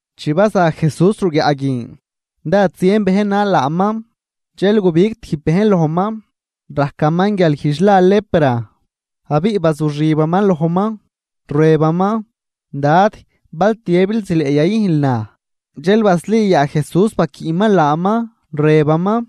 Chi baza Jesús ruguiaꞌ guin, dád zien bejn nal laaman. Dxel gubig tijb bejn lojman rajcaman guialguijdx la lepra, abiꞌ bazuxibaman lojman, rëbaman: ―Dad, bal tiëbil, zileꞌ yayüjnl naj. Dxel basli yaa Jesús baquiꞌman laaman, rëbaman: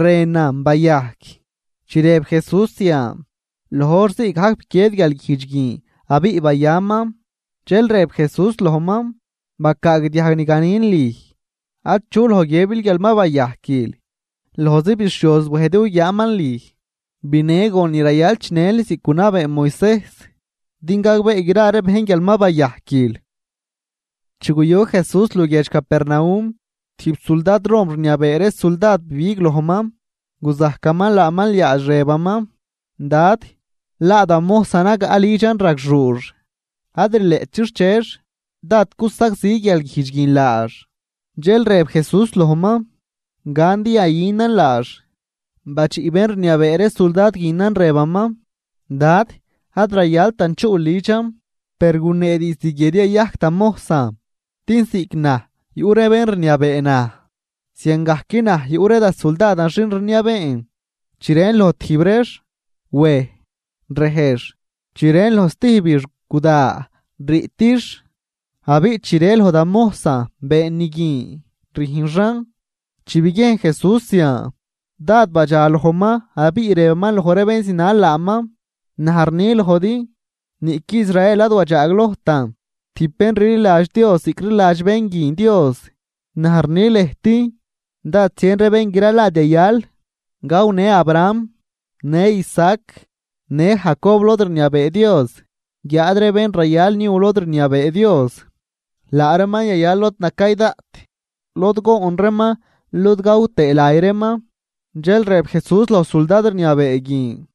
―Rënan. Bayajc. Chi rëb Jesús zian, loj hor ziigajc biquied guialguijdx guin abiꞌ bayaman. Dxel rëb Jesús lojman: ―Bacaagdiajg ni ganin lüj. Achu loj guiëbil guial ma bayajquil. Lojzi bixhioz wej din guguiaaman lüj, binë gon ni rayal chinël ziꞌc gunabee Moisejs, din gagbee gra ree bejn guial ma bayajquil. Chi guyu Jesús luguiedx Capernaum, tijb suldad Rom rniabee ree suldad bibig lojman, guzajcaman laaman liaadx, rëbaman: ―Dad, laa da mojsan nagaꞌ lidxan ragxuux. Ad rileꞌt chixchex, dád cusagzi guialguijdx guin laax. Dxel rëb Jesús lojman: ―Gan din yayünan laax. Badxiꞌ bén rniabee ree suldad guinan, rëbaman: ―Dad, ad rayaltan chuꞌl lidxan, per gunee diizd guie din yayajc da mojsan. Din ziꞌc naj yuꞌ ree bén rniabee naj, ziangajc naj yuꞌ ree da suldadan xin rniabeen. Chi rën loj tijb reex: “Wej”, rejx, chi rën loj stijbix: “Guda,” riꞌtix. Abiꞌ chi rë loj da mojsan: “Been ni guin”, rüjnxan. Chi biguiejn Jesús zian, dád badxalojman abiꞌ rëbaman loj ree bén zinal laaman: ―Naj rni lojdi, niꞌqui Israel ad wadxaaglojtan tijb bén rliladx Dios ziꞌc rliladx bén guin Dios. Naj rni lëjt, dád zien ree bén gralad yayal gawnë Abraham, në Isaac, në Jacob lod rniabee Dios. Guiáad ree bén rayal niu lod rniabee Dios, laa reeman yayal lod nacay daꞌt lod goon reeman lod gaw tëë lay reeman. Dxel rëb Jesús loj suldad rniabee guin: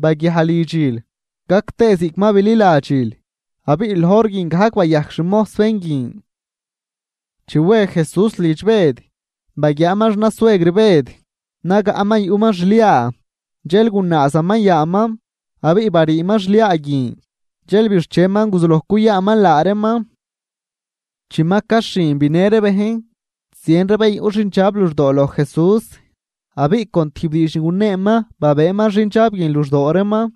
―Baguiaj lidxil, gac tëë ziꞌc ma bililadxil. Abiꞌ loj hor guin gajc bayajc xmojs bén guin. Chi we Jesús lidx Bëd, baguiaaman xnasuegr Bëd nagaꞌman yuꞌman xliaa. Dxel gunaazaman yaaman, abiꞌ bariiman xliaa guin, dxel bixcheman guzuloj cuyaanman laa reeman. Chi ma caxhin, binë ree bejn zien ree bén yuꞌ xindxab luxdoo loj Jesús. Abiꞌ con tijb diidx ni guneeman babëëman xindxab guin luxdoo reeman,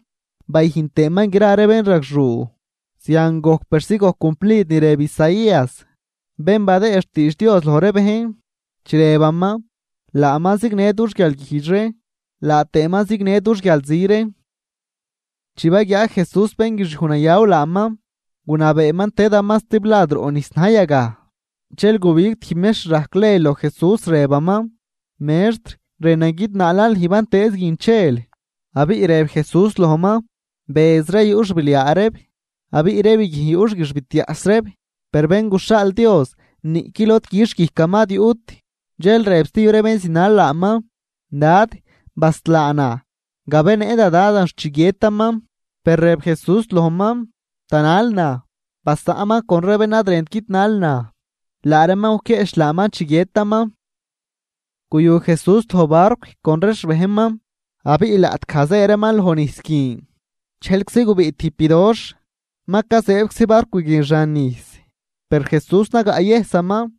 bayüjn tëëman gra ree bénragxuu. Zian gojc persi gojc cumplid ni rëb Isaías, bén badëë xtiidx Dios loj ree bejn, chi rëbaman: “Laaman zignë dux guialguijdx ree, laa tëëman zignë dux guialzi ree.” Chi baguiaa Jesús bénguixiuj nayaw laaman, gunabeeman tëdaman stiblad roꞌ nijs na̱j yagaj. Dxel gubig tijb mextr rajc ley loj Jesús, rëbaman: ―Mextr, rënan guidnaalan lüj bantëëz guin chel. Abiꞌ rëb Jesús lojman: ―Bëz ree yuꞌ xbiliaa reeb, abiꞌ ree biguijn yuꞌ xguixbitiaꞌs reeb. Per Bén guxhaal Dios niꞌqui lod quixh guijcaman ad yuꞌt. Dxel rëb stijb ree bén zinal laaman: ―Dad, baslaa naj gabenëꞌ da dadan xt chi guiëtaman. Per rëb Jesús lojman: ―Tanal naj, basaꞌnman con ree bén ad rënt guidnal naj, laa reeman guquieꞌch laaman chi guiëtaman. Guyu Jesús loj barcw con ree xbejnman, abiꞌ laꞌtgaj zë reeman loj nijs guin dxejlczi gubiꞌ tijb bidoxh, ma cazëëbczi barcw guin xan nijs. Per Jesús nagaꞌyëjsaman.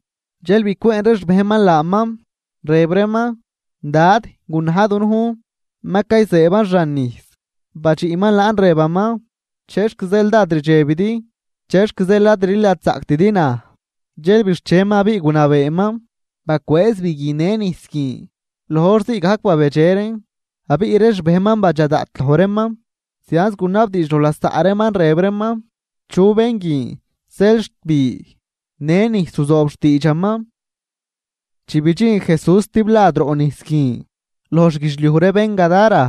Dxel bicwëën ree xbejnman laaman, rëb reeman: ―¡Dad, gunaj dunujn! ¡Ma cayzëëban xan nijs! Badxiꞌman laan rëbaman: ―¿Chexc zeel dád rdxebidi? ¿Chexc zeel ad rliladxzaꞌctidi naj? Dxel bixcheman abiꞌ gunabeeman bacwëëz bi guin në nijs guin. Loj hor ziigajc babedxe reen. Abiꞌ ree xbejnman badxa daꞌt loj reeman, zianz gunabdiidx loj lasaꞌ reeman, rëb reeman: ―¿Chu bén guin, zeel xt bi në nijs ruzoob xtiidxaman? Chi bidxin Jesús stiblad roꞌ nijs guin, loj xguidxliuj ree bén Gadara,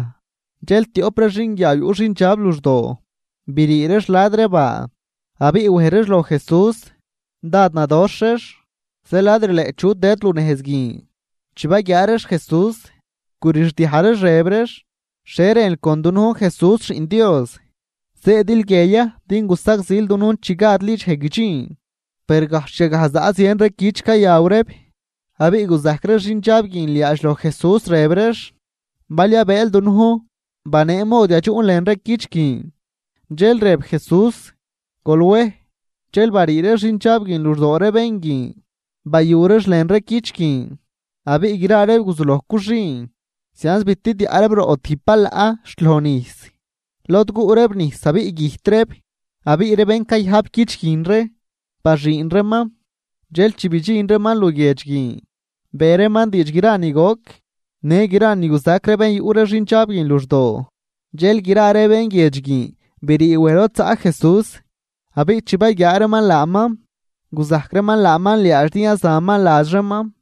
dxel tioꞌp ree xinguiaaw yuꞌ xindxab luxdoo brii reex la̱d ree baa abiꞌ wej reex loj Jesús. Dád nadoxh reex, zeel ad rileꞌt chu tëd lunejz guin. Chi baguiaa reex Jesús, gurixdiaj reex rëb reex: ―¿Xhie rënl con dunujn, Jesús, Xiꞌn Dios? ¿Zëëdil guie ya din gusagzil dunujn chi gadli dxej guidxin? Per gajxh yagaj zaꞌ zien ree cüch, cayaw reeb, abiꞌ guzajc ree xindxab guin liaadx loj Jesús, rëb reex: ―Bal yabëël dunujn, banee mod yadxuꞌn lën ree cüch guin. Dxel rëb Jesús: ―Gol wej. Dxel barii ree xindxab guin luxdoo ree bén guin bayu reex lën ree cüch guin. Abiꞌ gra reeb guzuloj cuxüün zianz bitidiaꞌ reeb roꞌ tijb balaꞌ xt loj nijs, lod guꞌ reeb nijs abiꞌ güjt reeb. Abiꞌ ree bén cayajp cüch guin ree, baxüün reeman. Dxel chi badxin reeman luguiedx guin, be reeman diidx gra ni goc në gra ni guzac ree bén yuꞌ ree xindxab guin luxdoo. Dxel gra ree bén guiedx guin brii wej lod zaꞌ Jesús, abiꞌ chi baguiaa reeman laaman, guzajc reeman laaman liaadx, din yazaman ladx reeman.